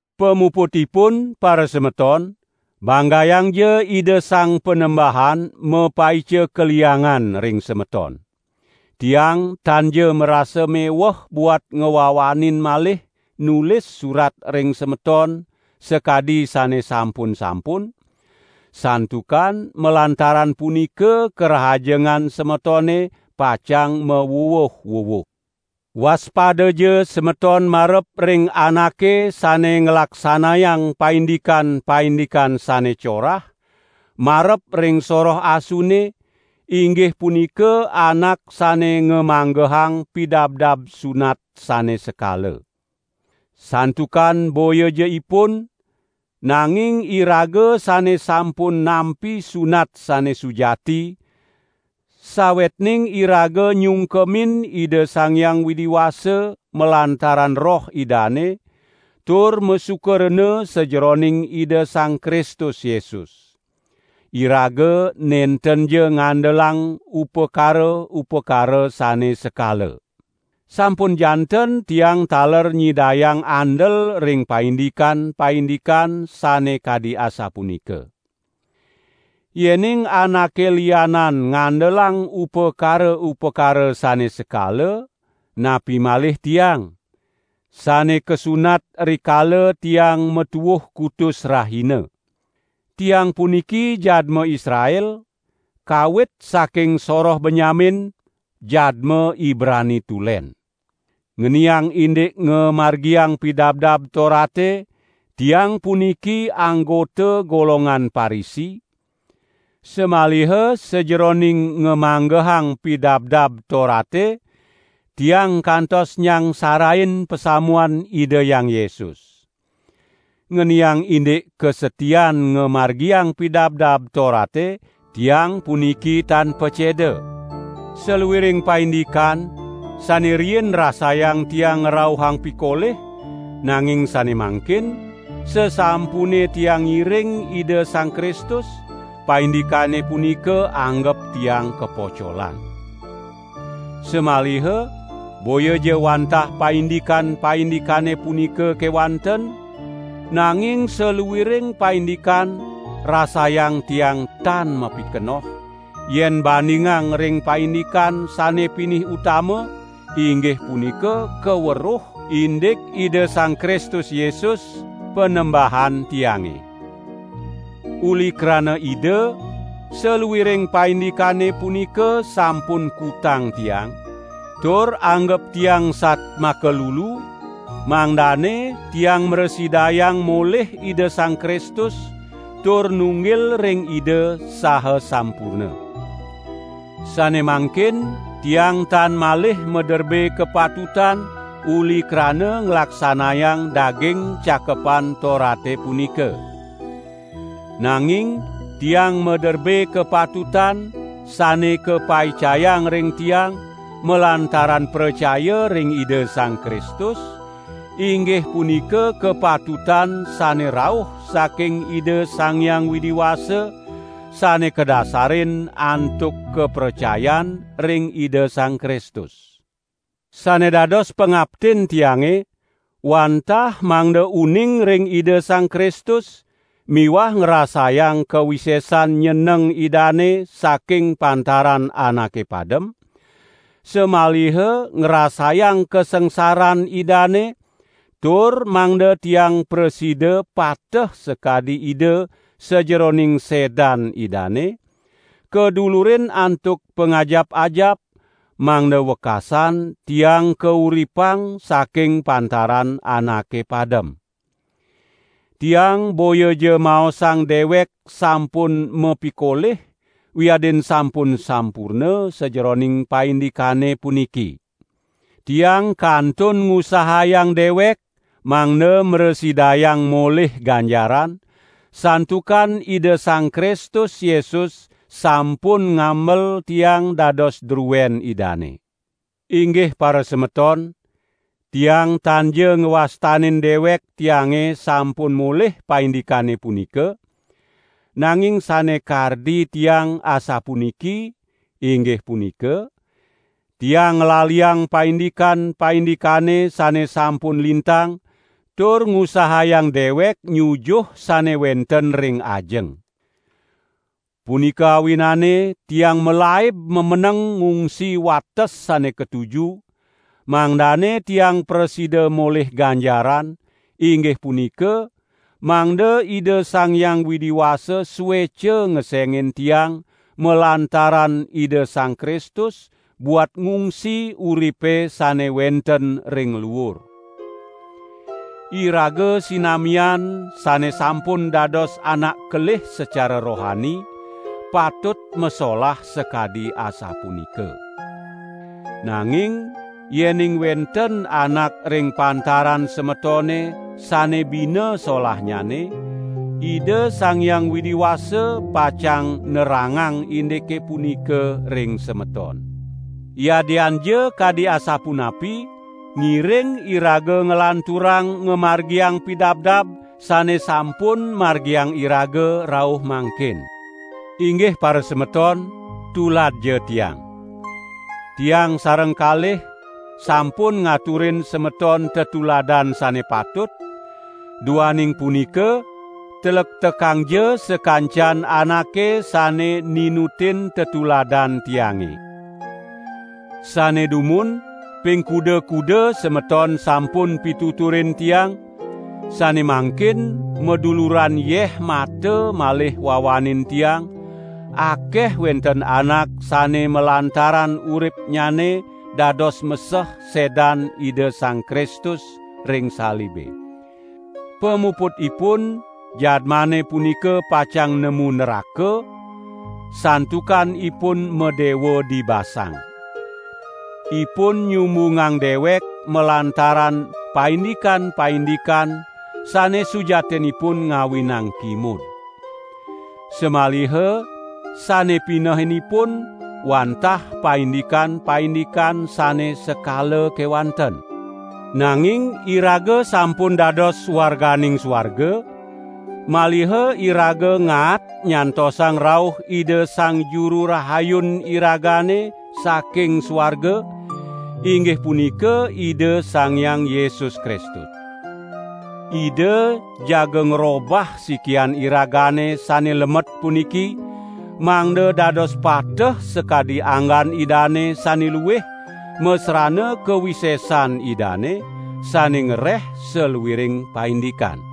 Pamuputipun, parasemeton, banggayang Ida Sang Panembahan mapaica kaliangan ring semeton. Tiang tanja marasa meweh buat ngwawanin malih nulis surat ring semeton sakadi sane sampun-sampun, santukan malantaran punika karahajengan semetone pacang mawuwuh-wuwuh. Waspadaja semeton marep ring anake sane nglaksanayang paindikan-paindikan sane corah, marep ring soroh asune, inggih punika anak sane ngamanggehang pidabdab sunat sane sekala. Santukan boyaja ipun, nanging iraga sane sampun nampi sunat sane sujati, sawetning iraga nyungkemin Ida Sang Hyang Widi Wasa malantaran Roh Idane, tur masuka rena sajeroning Ida Sang Kristus Yesus. Iraga nentenja ngandelang upakara-upakara sane sekala. Sampun janten tiang taler nyidayang andel ring paindikan-paindikan sane kadi asapunika. Yening anake lianan ngandelang upakara-upakara sane sekala, napi malih tiang, sane kasunat rikala tiang matuuh kutus rahina. Tiang puniki jadma Israel, kawit saking soroh Benyamin, jadma Ibrani tulen. Ngeniang indik ngamargiang Pidabdab Torate, tiang puniki anggota golongan Parisi, samaliha sajeroning ngamanggehang Pidabdab Torate tiang kantos nyangsarain pasamuan Ida Hyang Yesus. Ngeniang indik kasatian ngamargiang Pidabdab Torate tiang puniki tan paceda. Saluiring paindikan sane riin rasayang tiang ngrauhang pikolih, nanging sane mangkin, sasampune tiang ngiring Ida Sang Kristus, paindikane punika anggep tiang kapocolan. Samaliha boyaja wantah paindikan-paindikane punika kewanten, nanging saluiring paindikan rasayang tiang tan mapikenoh, yen bandingang ring paindikan sane pinih utama, inggih punika kaweruh indik Ida Sang Kristus Yesus, Panembahan tiange. Uli krana Ida, saluiring paindikane punika sampun kutang tiang, tur anggep tiang satmaka lulu, mangdane tiang mrasidayang molih Ida Sang Kristus, tur nunggil ring Ida saha sampurna. Sane mangkin tiang tan malih maderbe kapatutan uli krana nglaksanayang daging Cakepan Torate punika. Nanging tiang maderbe kapatutan sane kapaicayang ring tiang malantaran pracaya ring Ida Sang Kristus, inggih punika kapatutan sane rauh saking Ida Sang Hyang Widi Wasa, sane kadasarin antuk kapracayan ring Ida Sang Kristus. Sane dados pangaptin tiange wantah mangda uning ring Ida Sang Kristus miwah ngrasayang kawisesan nyeneng Idane saking pantaran anake padem; samaliha ngrasayang kasangsaran Idane, tur mangda tiang prasida pateh sakadi Ida sajeroning sedan Idane, kadulurin antuk pangajap-ajap, mangda wekasan tiang kauripang saking pantaran anake padem. Tiang boyaja maosang dewek sampun mapikolih wiadin sampun sampurna sajeroning paindikane puniki. Tiang kantun ngusahayang dewek mangda mrasidayang molih ganjaran, santukan Ida Sang Kristus Yesus sampun ngamel tiang dados druen Idane. Inggih parasemeton, tiang tanja ngwastanin dewek tiange sampun molih paindikane punika, nanging sane kardi tiang asapuniki, inggih punika: tiang nglaliang paindikan-paindikane sane sampun lintang tur ngusahayang dewek nyujuh sane wenten ring ajeng. Punika awinane tiang malaib mameneng ngungsi wates sane katuju, mangdane tiang prasida molih ganjaran, inggih punika, mangda Ida Sang Hyang Widi Wasa sueca ngesengin tiang malantaran Ida Sang Kristus buat ngungsi uripe sane wenten ring luur. Iraga sinamian sane sampun dados anak kelih sacara rohani, patut masolah sakadi asapunika. Nanging yening wenten anak ring pantaran semetone sane bina solahnyane, Ida Sang Hyang Widi Wasa pacang nerangang indike punika ring semeton. Yadianja kadi asapunapi, ngiring iraga nglanturang ngamargiang pidabdab sane sampun margiang iraga rauh mangkin. Inggih parasemeton, tuladja tiang. Tiang sareng kalih sampun ngaturin semeton tetuladan sane patut, duaning punika tlektekangja sakancan anake sane ninutin tetuladan tiange. Sane dumun ping kuda-kuda semeton sampun pituturin tiang, sane mangkin maduluran yeh mata malih wawanin tiang; akeh wenten anak sane malantaran uripnyane dados meseh sedan Ida Sang Kristus ring salibe. Pamuputipun jadmane punika pacang nemu nraka, santukan ipun madewa dibasang. Ipun nyumbungang dewek malantaran paindikan-paindikan sane sujatinipun ngawinang kimud. Samaliha sane pinehin ipun wantah paindikan-paindikan sane sekala kewanten. Nanging iraga sampun dados warganing suarga, maliha iraga ngaat nyantosang rauh Ida Sang Juru Rahayun iragane saking suarga, inggih punika Ida Sang Hyang Yesus Kristus. Ida jaga ngrobah sikian iragane sane lemet puniki, mangda dados pateh sakadi anggan Idane sane luih masrana kawisesan Idane, sane ngreh saluiring paindikan.